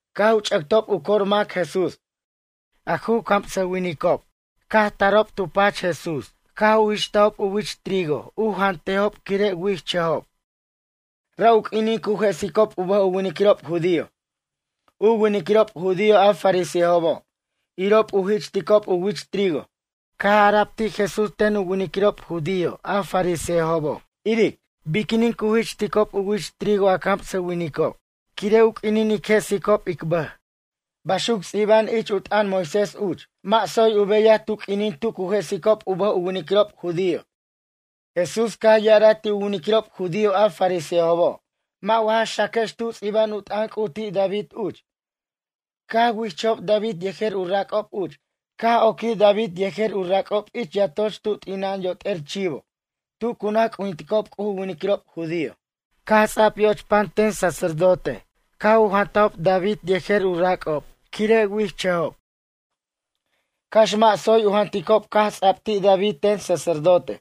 Caj u ch'ʌctob u cor mac Jesús. A ju camsʌwinicob caj tarob tu pach Jesús. Caj u ji'chtajob u wich trigo u jantejob quire' wichʌjob. Ra' u q'uinin cu jesicob u bʌj u winiquirob judío. U winiquirob judío a farisejobo', irob u ji'chticob u wich trigo. Caj ara'b ti' Jesús ten u winiquirob judío a farisejobo': ―Iric, biquinin cu ji'chticob u wich trigo a camsʌwinicob quire' u q'uinin ic jesicob ic bʌj. Baxuc ts'iba'an ich u t'ʌn Moisés uch. Mʌ' tsoy u beyaj tu q'uinin tu cu jesic u bʌj u winiquirob judío. Jesús caj ya'araj ti' u winiquirob judío a farisejobo': ―Mʌ' wa ja xacajex tu ts'iba'an u t'ʌn C'uj ti' David uch? Caj wichʌjob David yejer u rac'ob uch. Caj oquij David yejer u rac'ob ich yatoch tu t'ina'an yot'er chivo tu cu naj c'ujinticob C'uj u winiquirob judío. Caj ts'a'b yo'och pan ten sacerdote ca' u jantajob David yejer u rac'ob quire' wichʌjob, cax mʌ' tsoy u janticob caj ts'ab ti' David ten sacerdote.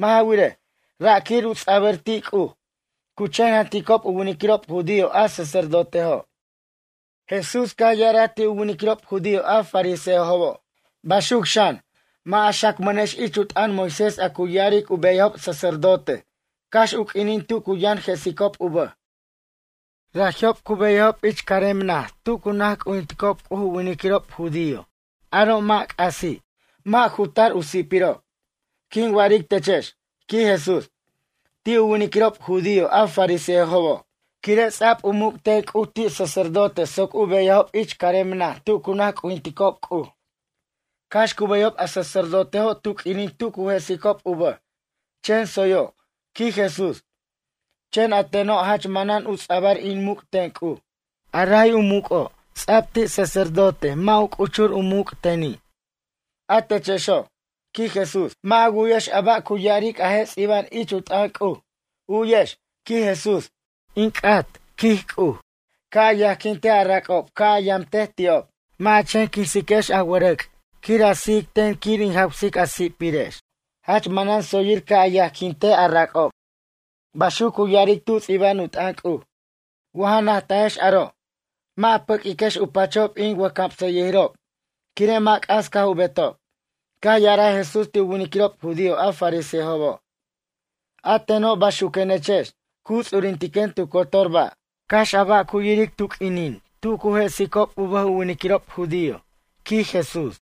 Mʌ' ja wirej, ra' quir u ts'abʌr ti' C'uj. Cu chen janticob u winiquirob judío a sacerdotejo'. Jesús caj ya'araj ti' u winiquirob judío a farisejobo': ―Baxuc xan, mʌ' a xacmʌnex ich u t'ʌn Moisés a cu ya'aric u beyajob sacerdote cax u q'uinin tu cu yʌn jesicob u bʌj. Raji'ob cu beyajob ich carem naj tu cu naj c'ujinticob C'uj u winiquirob judío aro' mʌ' c'asi'. Mʌ' ju tar u si'pirob. Quin wa'aric techex ―quij Jesús―, ti' u winiquirob judío a farisejobo'. Quire' ts'a'b u muc' ten C'uj ti' sacerdote soc u beyajob ich carem naj tu cu naj c'ujinticob C'uj. Cax cu beyajob a sacerdotejo' tu q'uinin tu cu jesicob u bʌj, chen tsoyo' ―quij Jesús―. Chen a teno' jach manan u ts'abʌr in muc' ten C'uj. A ray u muc'o' ts'a'b ti' sacerdote mʌ' u c'uchur u muc' teni'. A techexo', ―quij Jesús― mʌ' a wu'yex a ba' cu ya'aric a je' ts'iba'an ich u t'ʌn C'uj? U'yex ―quij Jesús―: “In c'at ―quij C'uj―, ca' a yajquintej a rac'ob ca' a yamtej ti'ob. Mʌ' a chen quinsiquex a wʌrʌc' quir a sijic ten quir in jawsic a si'pirex. Jach manan tsoyir ca' a yajquintej a rac'ob.” Baxuc cu ya'aric tu ts'iba'an u t'ʌn C'uj. Wa ja najtajex aro', mʌ' a pʌq'uiquex u pachob in wʌjcamsayʌjirob, quire' mʌ' c'as caj u betob. Caj ya'araj Jesús ti' u winiquirob judío a farisejobo': ―A teno' baxuquenechex, cu ts'urintiquen tu cotor ba', cax a ba' cu yiric mac tu q'uinin tu cu jesicob u bʌj u winiquirob judío ―quij Jesús.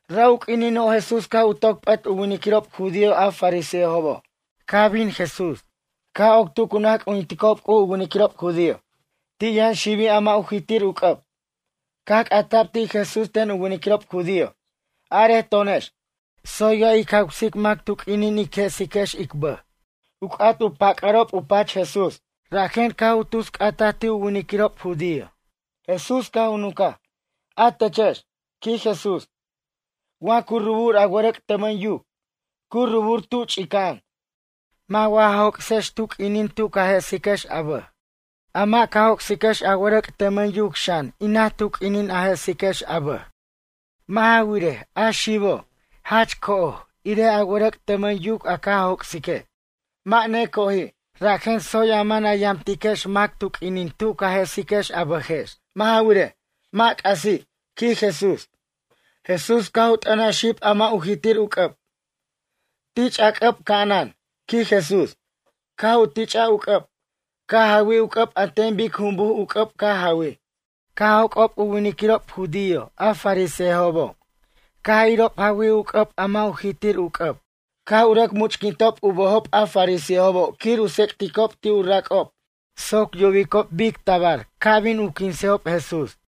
Ra' u q'uinino' Jesús caj toc p'at u winiquirob judío a farisejobo', caj bin Jesús, caj oc tu cu naj c'ujinticob C'uj u winiquirob judío. Ti' yʌn xibi' a mʌ' u jitir u c'ʌb. Caj c'ata'b ti' Jesús ten u winiquirob judío: ―Are to'onex. Tsoy wa jic jawsic mac tu q'uinin ic jesicob ic bʌj? U c'at u pac'arob u pach Jesús, rajen caj u tus c'atic u winiquirob judío. Jesús caj u nuncaj: ―A techex ―quij Jesús―, wa cu rubur a wʌrʌc' tʌmʌn yuc. Cu rubur tu ch'ica'an. Mʌ' wa ja joc'sex enan tu q'uinin tu ca jesiquex a bʌj? A mʌ' ca joc'siquex a wʌrʌc' tʌmʌn yuc xan enaj tu q'uinin a jesiquex a bʌj. Mʌ' ja wirej, a xibo', jach co'oj enan a wʌrʌc' tʌmʌn yuc a ca joc'sique', mʌ' neco'oji'. Rajen tsoy a man a yamtiquex mac tu q'uinin tu ca jesiquex a bʌjex. Mʌ' ja wirej, mʌ' c'asi' ―quij Jesús. Jesús caj u t'ʌnaj xib a mʌ' u jitir u c'ʌb: ―Tich' a c'ʌb ca'anan ―quij Jesús. Caj u tich'aj u c'ʌb, caj jawij u c'ʌb an ten bic jumbuj u c'ʌb caj jawij. Caj joc'ob u winiquirob judío a farisejobo' caj irob jawij u c'ʌb a mʌ' ju jitir u c'ʌb. Caj u rʌc much'quintob u bʌjob a farisejobo' quir u tsicbʌticob ti' u rac'ob soc yubicob bic tabar ca' bin u quinsejob Jesús.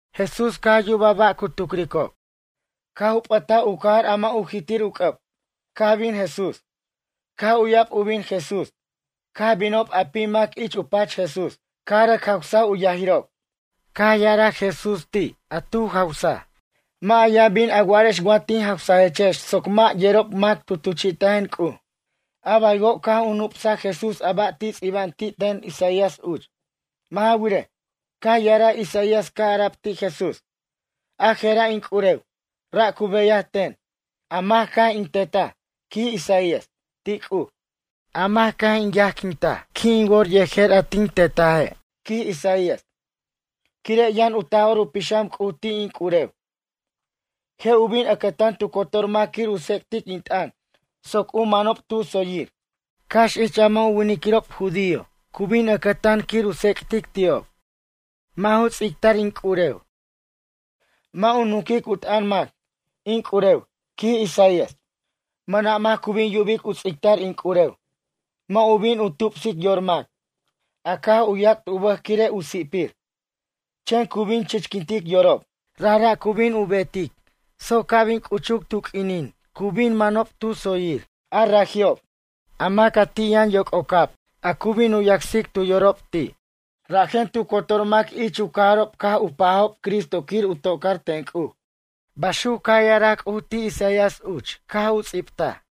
Jesús caj yubaj ba' cu tucricob. Caj u p'ʌtaj u cajar a mʌ' u jitir u c'ʌb, caj bin Jesús. Caj uya'b u bin Jesús, caj binob a pim mac ich u pach Jesús. Caj rʌc jawsaj u yajirob. Caj ya'araj Jesús ti' a tu jawsaj: ―Mʌ' a yʌn bin a wa'arex wa tin jawsajechex soc mʌ' yerob mac tu tuchi'tajen C'uj. A baywo' caj u nup'saj Jesús a ba' ts'ibta'b ti' ten Isaías uch. Mʌ' ja wirej, caj ya'araj Isaías caj ara'b ti' Jesús: A jera' in c'urew, ra' cu beyaj ten, a mac caj in tetaj, quij Isaías, ti' C'uj. A mac caj in yajquintaj qui' in wor yejer a tin tetaje', quij Isaías, quire' yʌn u Taj'or u Pixam C'uj ti' in c'urew. Je' u bin ʌcʌtan tu cotor mac quir u tsec'tic in t'ʌn soc u manob tu tsoyir. Cax ich a mʌ' u winiquirob judío cu bin ʌcʌtan quir u tsec'tic ti'ob. Mʌ' ju ts'ictar in c'urew, mʌ' u nunquic u t'ʌn mac, in c'urew, quij Isaías. Mʌna' mac cu bin yubic u ts'ictar in c'urew. Mʌ' u bin u tupsic yor mac, a caj u yac't u bʌj quire' u si'pir. Chen cu bin chichquintic yorob. Rajra' cu bin u betic soc ca' bin c'uchuc tu q'uinin cu bin manob tu tsoyir. A raji'ob, a mac a ti' yʌn yoc'ocab a cu bin u yacsicob tu yorob ti'. Rajen tu cotor mac ich u cajarob caj u pajob Cristo quir u tocar ten C'uj. Baxuc caj ya'araj C'uj ti' Isaías uch caj u ts'ibtaj.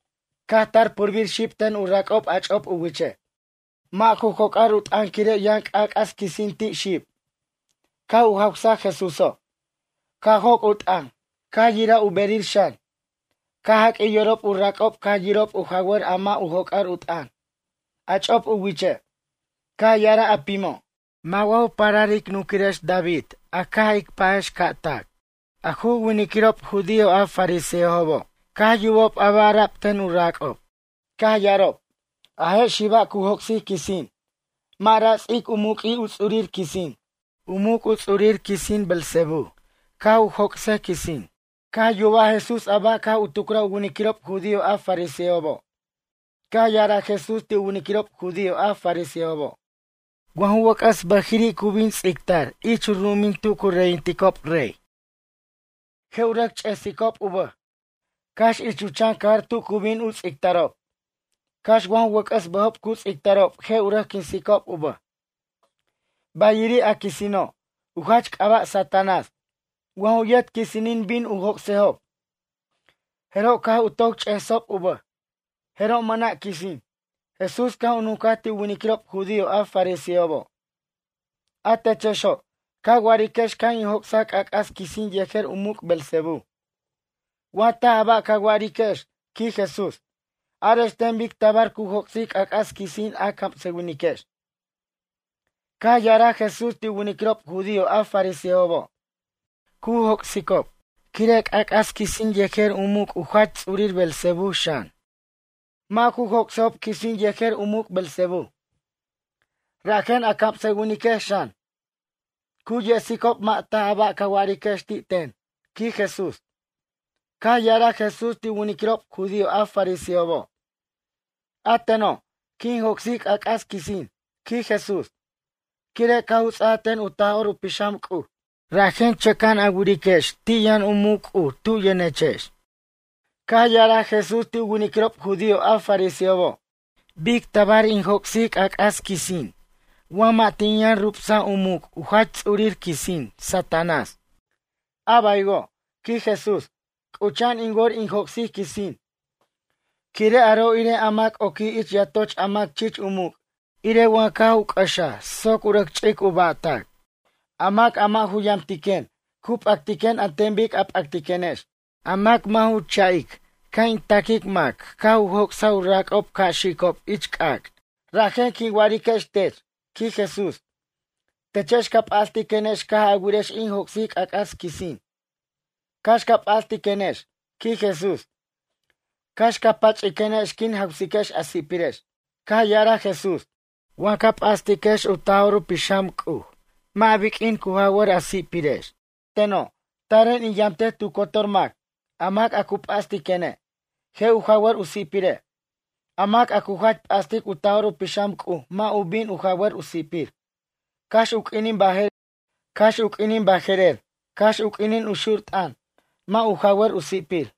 Caj tar purbir xib ten u rac'ob a ch'op u wiche'. Mʌ' ju joc'ar u t'ʌn quire' yʌn c'ac'as quisin ti' xib. Caj u jawsaj Jesúso', caj joc' u t'ʌn, caj yiraj u berir xan. Caj jaq'uij yorob u rac'ob caj yirob u jawar a mʌ' u joc'ar u t'ʌn, a ch'op u wich uche'. Caj ya'araj a pimo': ―Mʌ' wa ju parar ic nunquirex David a caj ic pajex ca' tac? A ju winiquirob judío a fariseobo' caj yubob a ba' ara'b ten u rac'ob. Caj ya'arob: ―A je' xiba' cu joc'sic quisin. Mʌ' ra' ts'ic u muq'ui' u ts'urir quisin. U muc' u ts'urir quisin Beelzebú caj u joc'sej quisin. Caj yubaj Jesús a ba' caj u tucraj u winiquirob judío a fariseobo'. Caj ya'araj Jesús ti' u winiquirob judío a fariseobo': ―Wa ju wʌc'ʌs bʌjiri' cu bin ts'ictar ich u ru'umin tu cu reyinticob rey. Je' u rʌc ch'esicob u bʌj. Cax ich u chan cajar tu cu bin u ts'ictarob. Cax wa ju wʌc'ʌs bʌjob cu ts'ictarob je' u rʌc quinsicob u bʌj. Bayiri' a quisino', u jach c'aba' Satanás. Wa ju yet quisinin bin u joc'sejob. Jeroj caj u toc ch'esob u bʌj. Jeroj mʌna' quisin. Jesús caj u nuncaj ti' u winiquirob judío a fariseobo': ―A techexo', ca wa'ariquex caj in joc'saj c'ac'as quisin yejer u muc' Beelzebú. Wa taj a ba' ca wa'ariquex ―quij Jesús―. Arex ten bic tabar cu joc'sic c'ac'as quisin a camsʌwiniquex? Caj ya'araj Jesús ti' u winiquirob judío a fariseobo': ―Cu joc'sicob quire' c'ac'as quisin yejer u muc' jach ts'ur Beelzebú xan. Mʌ' ju joc'sejob quisin yejer u muc' Beelzebú. Rajen a camsʌwiniquex xan, cu yesicob mʌ' taj a ba' ca wa'ariquex ti' ten ―quij Jesús. Caj ya'araj Jesús ti' u winiquirob judío a fariseobo': ―A teno', quin joc'sic c'ac'as quisin ―quij Jesús―. Quire' caj u ts'aj ten u Taj'or u Pixam C'uj. Rajen chʌca'an a wiriquex ti' yʌn u muc' C'uj tu yʌnechex. Caj ya'araj Jesús ti' u winiquirob judío a fariseobo': ―Bic tabar in joc'sic u c'ac'as quisin wa mʌ' tin yʌn rubsaj u muc' u jach ts'urir quisin, Satanás? A baywo' ―quij Jesús―, c'ucha'an in wor in joc'sic quisin. Quire' aro' irej a mac oquij ich yatoch a mac chich u muc' irej wa caj u c'ʌxaj soc u rʌc ch'ic u ba'tac. ’A mac a mʌ' ju yamtiquen, cu p'actiquen an ten bic a p'actiquenex. A mac mʌ' ju cha'ic ca' in taquic mac caj u joc'saj u rac'ob ca' xicob ich c'ac'. ’Rajen quin wa'ariquex tech ―quij Jesús―. Techex ca p'astiquenex caj a wirex in joc'sic c'ac'as quisin. Cax ca p'astiquenex ―quij Jesús―. Cax ca pach'iquenex quin jawsiquex a si'pirex. Caj ya'araj Jesús: ―Wa ca p'astiquex u Taj'or u Pixam C'uj mʌ' biq'uin cu jawʌr a si'pirex. A teno', taren in yamtej tu cotor mac. A mac a cu p'astiquene', je' u jawʌr u si'pire'. A mac a cu jach p'astic u Taj'or u Pixam C'uj mʌ' u bin jawʌr u si'pir, cax u q'uinin baje'rer, cax u q'uinin u xur t'ʌn, mʌ' u jawʌr u si'pir.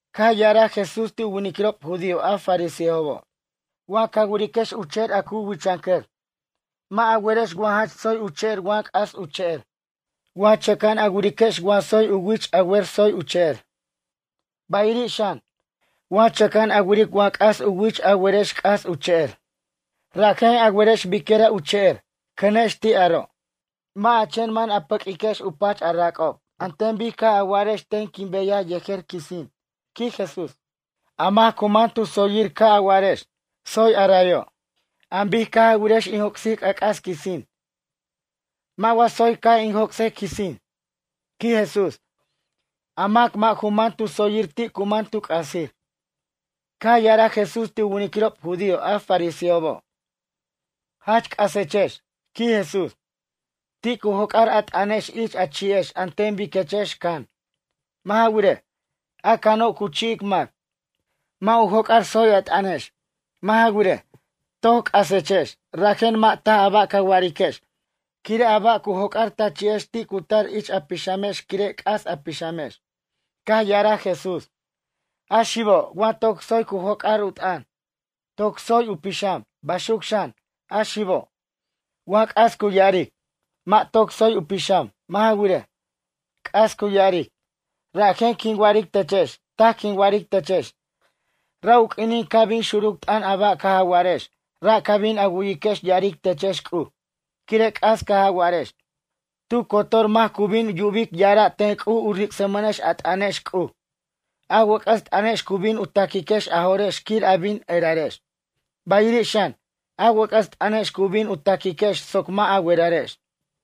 Caj ya'araj Jesús ti' u winiquirob judío a fariseobo': ―Wa ca wiriquex u che'er a cu wichʌncʌr. Mʌ' a werex wa jach tsoy u che'er wa c'as u che'er. Wa chʌca'an a wiriquex wa tsoy u wich a wer tsoy u che'er. Bayiri' xan, wa chʌca'an a wiric wa c'as u wich a werex c'as u che'er. Rajen a werex biquira' u che'er. Cʌnex ti' aro'. Mʌ' a chen man a pʌq'uiquex u pach a rac'ob, an ten bic caj a wa'arex ten quin beyaj yejer quisin ―quij Jesús―. A mac cu man tu tsoyir ca' a wa'arex: “Tsoy a rayo'”, an bic caj a wirex in joc'sic c'ac'as quisin. Mʌ' wa tsoy ca' in joc'sej quisin? ―quij Jesús―. A mac mʌ' ju man tu tsoyir ti' cu man tu c'asir. Caj ya'araj Jesús ti' u winiquirob judío a fariseobo': ―Jach c'asechex ―quij Jesús―. Ti' cu joc'ar a t'ʌnex ich a chi'ex an ten biquechex can. Mʌ' ja wirej, a cano', cu chi'ic mac. Mʌ' u joc'ar tsoy a t'ʌnex. Mʌ' ja wirej, toc c'asechex. Rajen mʌ' taj a ba' ca wa'ariquex, quire' a ba' cu joc'ar ta chi'ex ti' cu tar ich a pixamex quire' c'as a pixamex. Caj ya'araj Jesús: ―A xibo', wa toc tsoy cu joc'ar u t'ʌn, toc tsoy u pixam. Baxuc xan, a xibo', wa c'as cu ya'aric, mʌ' toc tsoy u pixam. Mʌ' ja wirej, c'as cu ya'aric. Rajen quin wa'aric techex. Taj quin wa'aric techex, ra' u q'uinin ca' bin xuruc t'ʌn a ba' caj a wa'arex ra' ca bin a wuyiquex ya'aric techex C'uj. Quire' c'as caj a wa'arex. Tu cotor mac cu bin yubic ya'ara' ten C'uj u ric'smʌnex a t'ʌnex C'uj. A wʌc'ʌs t'ʌnex cu bin u ta'quiquex a jo'rex quir a bin erarex. Bayiri' xan, a wʌc'ʌs t'ʌnex cu bin u taquiquex soc mʌ' a werarex.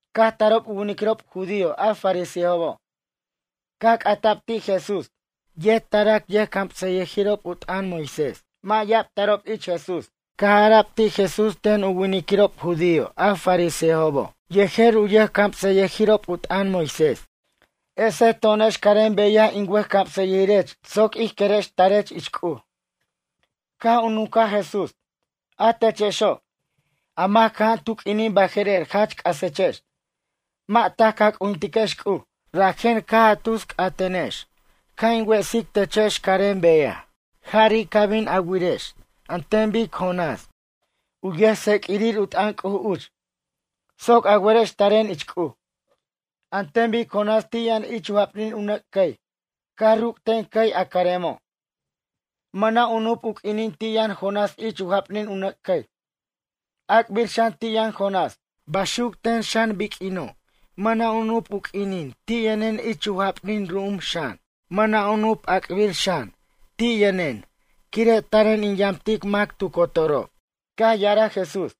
Caj tarob u winiquirob judío a fariseobo'. Caj c'ata'b ti' Jesús. Yet tarac yʌjcamsʌyʌjirob u t'ʌn Moisés. Mʌ' ya'ab tarob ich Jesús. Caj ara'b ti' Jesús ten u winiquirob judío a fariseobo' yejer u camsʌyʌjirob u t'ʌn Moisés: ―Esej to'onex carem beyaj in wʌjcamsʌyʌjirech soc ij querex tarech ich C'uj. Caj u nuncaj Jesús: ―A techexo', a mac cʌja'an tu q'uinin baje'rer jach c'asechex. Mʌ' taj ca c'ujintiquex C'uj. Rajen caj a tus c'atenex ca' in wesic techex carem beyaj. Jari' ca bin a wirex an ten bic Jonásen, u yʌjtseq'uirir u t'ʌn C'uj uch, soc a werex taren ich C'uj. An ten bic Jonás ti' yʌn ich u japnin u nʌc' cʌy. Caj ruc' ten cʌy a caremo'. Mʌna' u nup' u q'uinin ti' yʌn Jonás ich u japnin u nʌc' cʌy. Ac'bir xan ti' yʌn Jonás. Baxuc ten xan biq'uino' mʌna' u nup' u q'uinin ti' yʌnen ich u japnin ru'um xan. Mʌna' u nup' ac'abir xan ti' yʌnen quire' taren in yamtic mac tu cotorob. Caj ya'araj Jesús: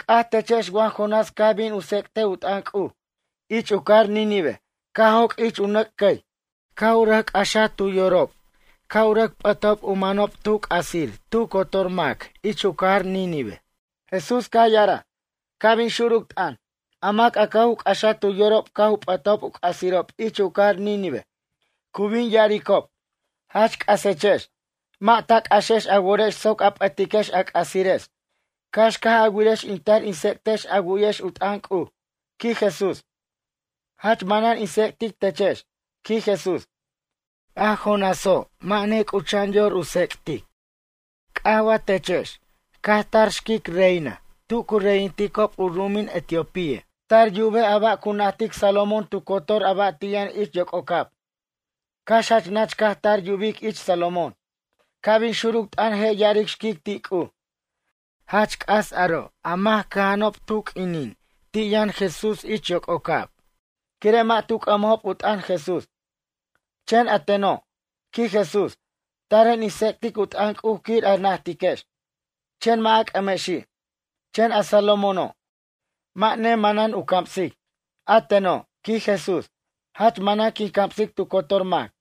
―C'aj techex wa Jonás caj bin u tsec'tej u t'ʌn C'uj ich u cajar Nínive caj joc' ich u nʌc' cʌy. Caj u rʌc c'axaj tu yorob ca' u rʌc p'ʌtob u manob tu c'asir tu cotor mac ich u cajar Nínive. Jesús caj ya'araj: ―Ca' bin xuruc t'ʌn, a mac caj u c'axaj tu yorob caj u p'ʌtajob u c'asirob ich u cajar Nínive cu bin ya'aricob: “Jach c'asechex”, mʌ' ta c'axex a worex soc a p'ʌtiquex a c'asirex cax caj a wirex in tar in tsec'techex a wu'yex u t'ʌn C'uj ―quij Jesús―. Jach manan in tsec'tic techex ―quij Jesús―. A Jonáso' mʌ' nec'ucha'an yor u tsec'tic. C'aj wa techex, caj tar xquic reina tu cu reyinticob u ru'umin Etiopía. Tar yubej a ba' cu najtic Salomón tu cotor a ba' ti' yʌn ich yoc'ocab. Cax jach nach caj tar yubic ich Salomón. Ca' bin xuruc t'ʌn je' ya'aric xquic ti' C'uj: “Jach c'as aro' a mac cʌja'anob tu q'uinin ti' yʌn Jesús ich yoc'ocab. Quire' mʌ' tu c'ʌmajob u t'ʌn Jesús.” Chen a teno' ―quij Jesús―, taren in tsec'tic u t'ʌn C'uj quir a najtiquex, chen mʌ' a c'ʌmexi'. Chen a Salomóno', mʌ' ne manan u camsic. A teno' ―quij Jesús―, jach manan quin camsic tu cotor mac.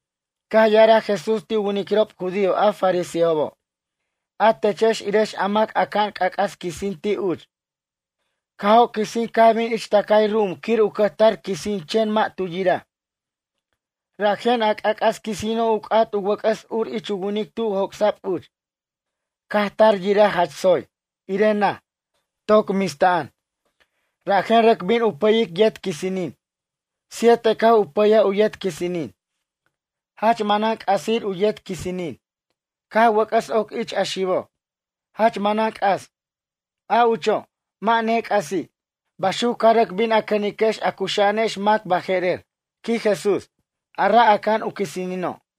Caj ya'araj Jesús ti' u winiquirob judío a fariseobo': ―A techex irex a mac aca'an c'ac'as quisin ti' uch. Caj joc quisin' caj bin ich tʌcay ru'um quir u cʌjtar quisin chen mʌ' tu yiraj. Rajen a c'ac'as quisino' u c'at u wʌc'ʌs ur ich winic tu joc'sa'b uch. Caj tar yiraj jach tsoy, irej naj, toc mista'an. Rajen rʌc bin u pʌyic yet quisinin. Siete caj u pʌyaj u yet quisinin. Jach manan c'asir u yet quisinin. Caj wʌc'ʌs oc ich a xibo'. Jach manan c'as, a ucho', mʌ' nec'asi'. Baxuc ca rʌc bin a cʌniquex a cuxa'anex mac baje'rer ―quij Jesús―, a ra' aca'an u quisinino'.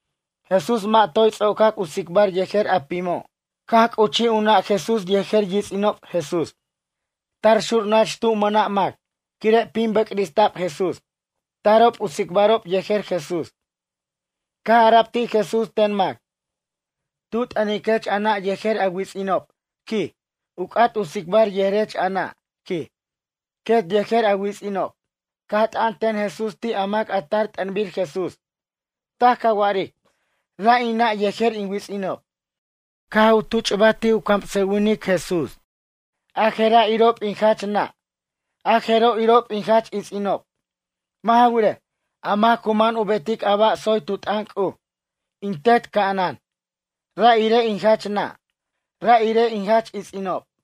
Jesús mʌ' toy ts'ocac u tsicbar yejer a pimo' caj c'uchij u nʌ' Jesús yejer yits'inob Jesús. Tar xur nach tu mʌna' mac, quire' pim bʌcrista'b Jesús. Tarob u tsicbarob yejer Jesús. Caj ara'b ti' Jesús ten mac: ―Tu t'ʌniquech a nʌ' yejer a wits'inob ―quij―. U c'at u tsicbar yejerech a nʌ' ―quij―, quet yejer a wits'inob. Caj t'an ten Jesús ti' a mac a tar t'ʌnbir Jesús: ―Taj ca wa'aric, ra' in nʌ' yejer in wits'inob. Caj u tuchbar ti' u camsʌwinic, Jesús: ―A jera' irob in jach nʌ'. A jeroj irob in jach its'inob. Mʌ' ja wirej, a mac cu man u betic a ba' tsoy tu t'ʌn C'uj, in Tet ca'anan. Ra' irej in jach nʌ'. Ra' irej in jach its'inob.